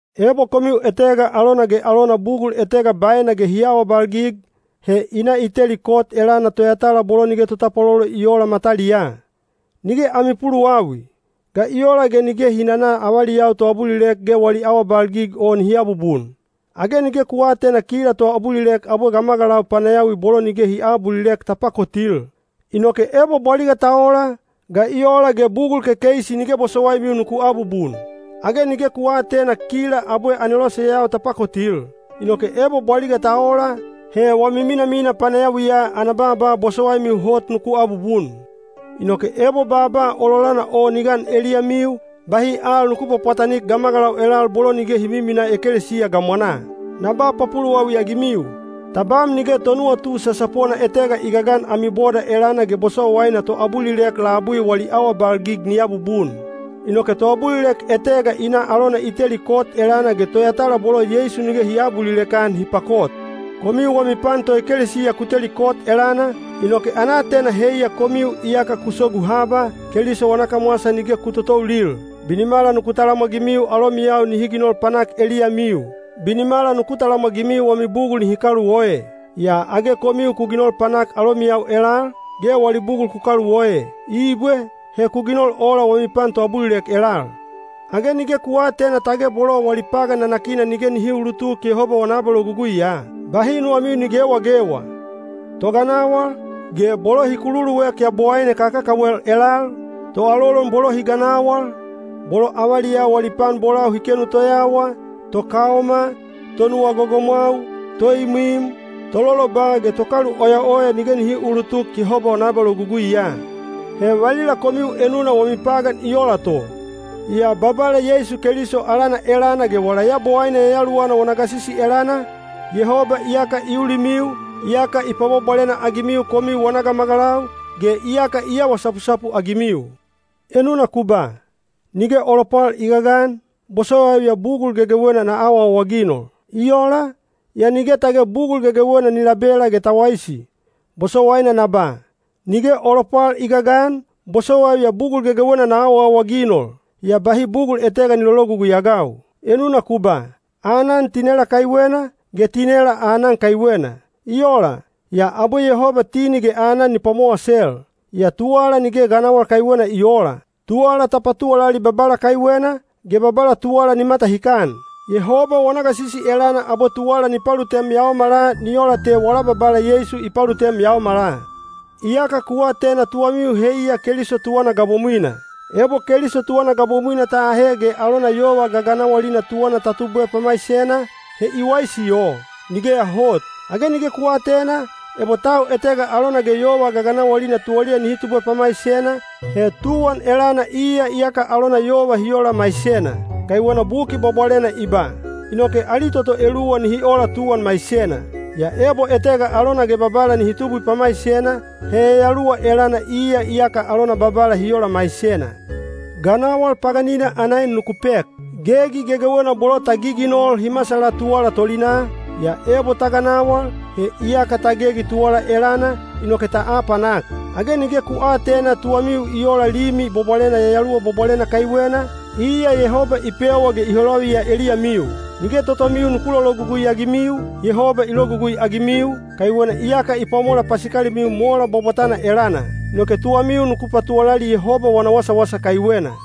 Ebo komiu etega alona ge alona bugul etega baena ge hi awabalgig, he i na i teli kot elana toyatala bolo nige totapwalolo i oola mataliyaa. Nige ami puluwawi! Ga i ola ge nige hi nana avaliyau toabulilek ge wali awabalgig o nihi aabubun? Age nige ku aatena kila toabulilek abwe gamagalau panayawi bolo nige hi aabulilek ta pakotil? Inoke ebo bwaliga ta ola, ga i ola ge bugul kekeisi nige bosowaimiu nuku abubun? Age nige ku aatena kila abwe aneloseyau ta pakotil? Inoke ebo bwaliga ta ola, he wami minamina panayawiya ana baaba bosowaimiu hot nuku abubun. Inoke ebo baaba ololana o ni gan eliyamiu, bahi al nuku pwapwatanik gamagalau elal bolo nige hi miminaa ekelesiya gamwanaa. Na ba papuluwawi-agimiu: tabam nige tonuwatu sasapona etega i gagan ami boda elana ge bosowaina toabulilek labui wali awabalgig ni abubun! Inoke toabulilek etega i na alona i teli kot elana ge toyatala bolo Yeisu nige hi aabulilek-an hi pakot! Komiu wami pan toekelesiya ku teli kot elana, inoke ana aatena heiya komiu iyaka ku sogu haba, Keliso wana kamwasa nige ku totoulil. Binimala nuku talamwagimiu alomiyau nihi ginol panak eliyamiu. Binimala nuku talamwagimiu wami bugul nihi kaluoe. Yaa age komiu ku ginol panak alomiyau elal, ge wali bugul ku kaluoe! Ibwe. He ku ginol ola wami pan toabulilek elal. Age nige ku aatena tage bolo wali pagan nanakina nige nihi uulutuk Yehoba wana abaloguguiya? Bahi nuwamiu ni gewagewa: toganawal, ge bolo hi kululuek yabowaine kakakawel elal, toalolon bolo hi ganawal, bolo avaliyau wali pan bolau hi kenu toyawa, tokaoma, tonuwa gogomwau, toimwim, tololoba ge tokaluoyaoya nige nihi uulutuk Yehoba wana abaloguguiya. He valila komiu enuna wami pagan i ola to. Yaa Babala Yeisu Keliso alana elana ge wala Yabowaine Yayaluwana wana gasisi elana, Yehoba iyaka i ulimiu, iyaka i pwabwabwalena-agimiu komiu wana gamagalau, ge iyaka i awa sapusapu-agimiu. Enuna ku ba, “Nige o lopwal i gagan, bosowaiu ya bugul gegewena na awaawaginol.” I ola, yaa nige tage bugul gegewena ni labela ge ta waisi. Bosowaina na ba, “Nige o lopwal i gagan, bosowaiu ya bugul gegewena na awaawaginol,” yaa bahi bugul etega ni lologugui-agau. Enuna ku ba, “Aanan tinela kaiwena, ge tinela aanan kaiwena.” I ola, yaa abwe Yehoba tini ge aanan ni pwamowasel. Yaa tuwala nige ganawal kaiwena i oola. Tuwala ta patuwalali Babala kaiwena, ge Babala tuwala ni matahikan. Yehoba wana gasisi elana abwe tuwala ni palutem yaomala ni ola te wala Babala Yeisu i palutem yaomala. Iyaka ku atena tuwamiu heiya Keliso tuwana gabomwina. Ebo Keliso tuwana gabomwina ta ahe ge alona yova gaganawalina tuwana ta tubwe pamaisena, he i waisi o? Nigeya hot! Age nige ku aatena, ebo tau etega alona ge yova gaganawalina tuwaliya nihi tubwe pamaisena, he tuwan elana iya iyaka alona yova hi ola maisena. Kaiwena Buki Bwabwalena i ba, “Inoke ali toto eluwa nihi ola tuwan maisena.” Yaa ebo etega alona ge Babala nihi tubwi pamaisena, he yayaluwa elana iya iyaka alona Babala hi ola maisena. Ganawal paganina ana en nuku pek. Gegi gegewena bolo ta giginol hi masala tuwala tolinaa, yaa ebo ta ganawal, he iyaka ta gegi tuwala elana, inoke ta apanak. Age nige ku aatena tuwamiu i ola Limi Bwabwalena Yayaluwa Bwabwalena kaiwena, iya Yehoba i pewa ge i holaviya eliyamiu! Nige totomiu nuku lologugui-agimiu, Yehoba i logugui-agimiu, kaiwena iyaka i pwamola pasikalimiu mola bwabwatana elana. Inoke tuwamiu nuku patuwalali Yehoba wana wasawasa kaiwena.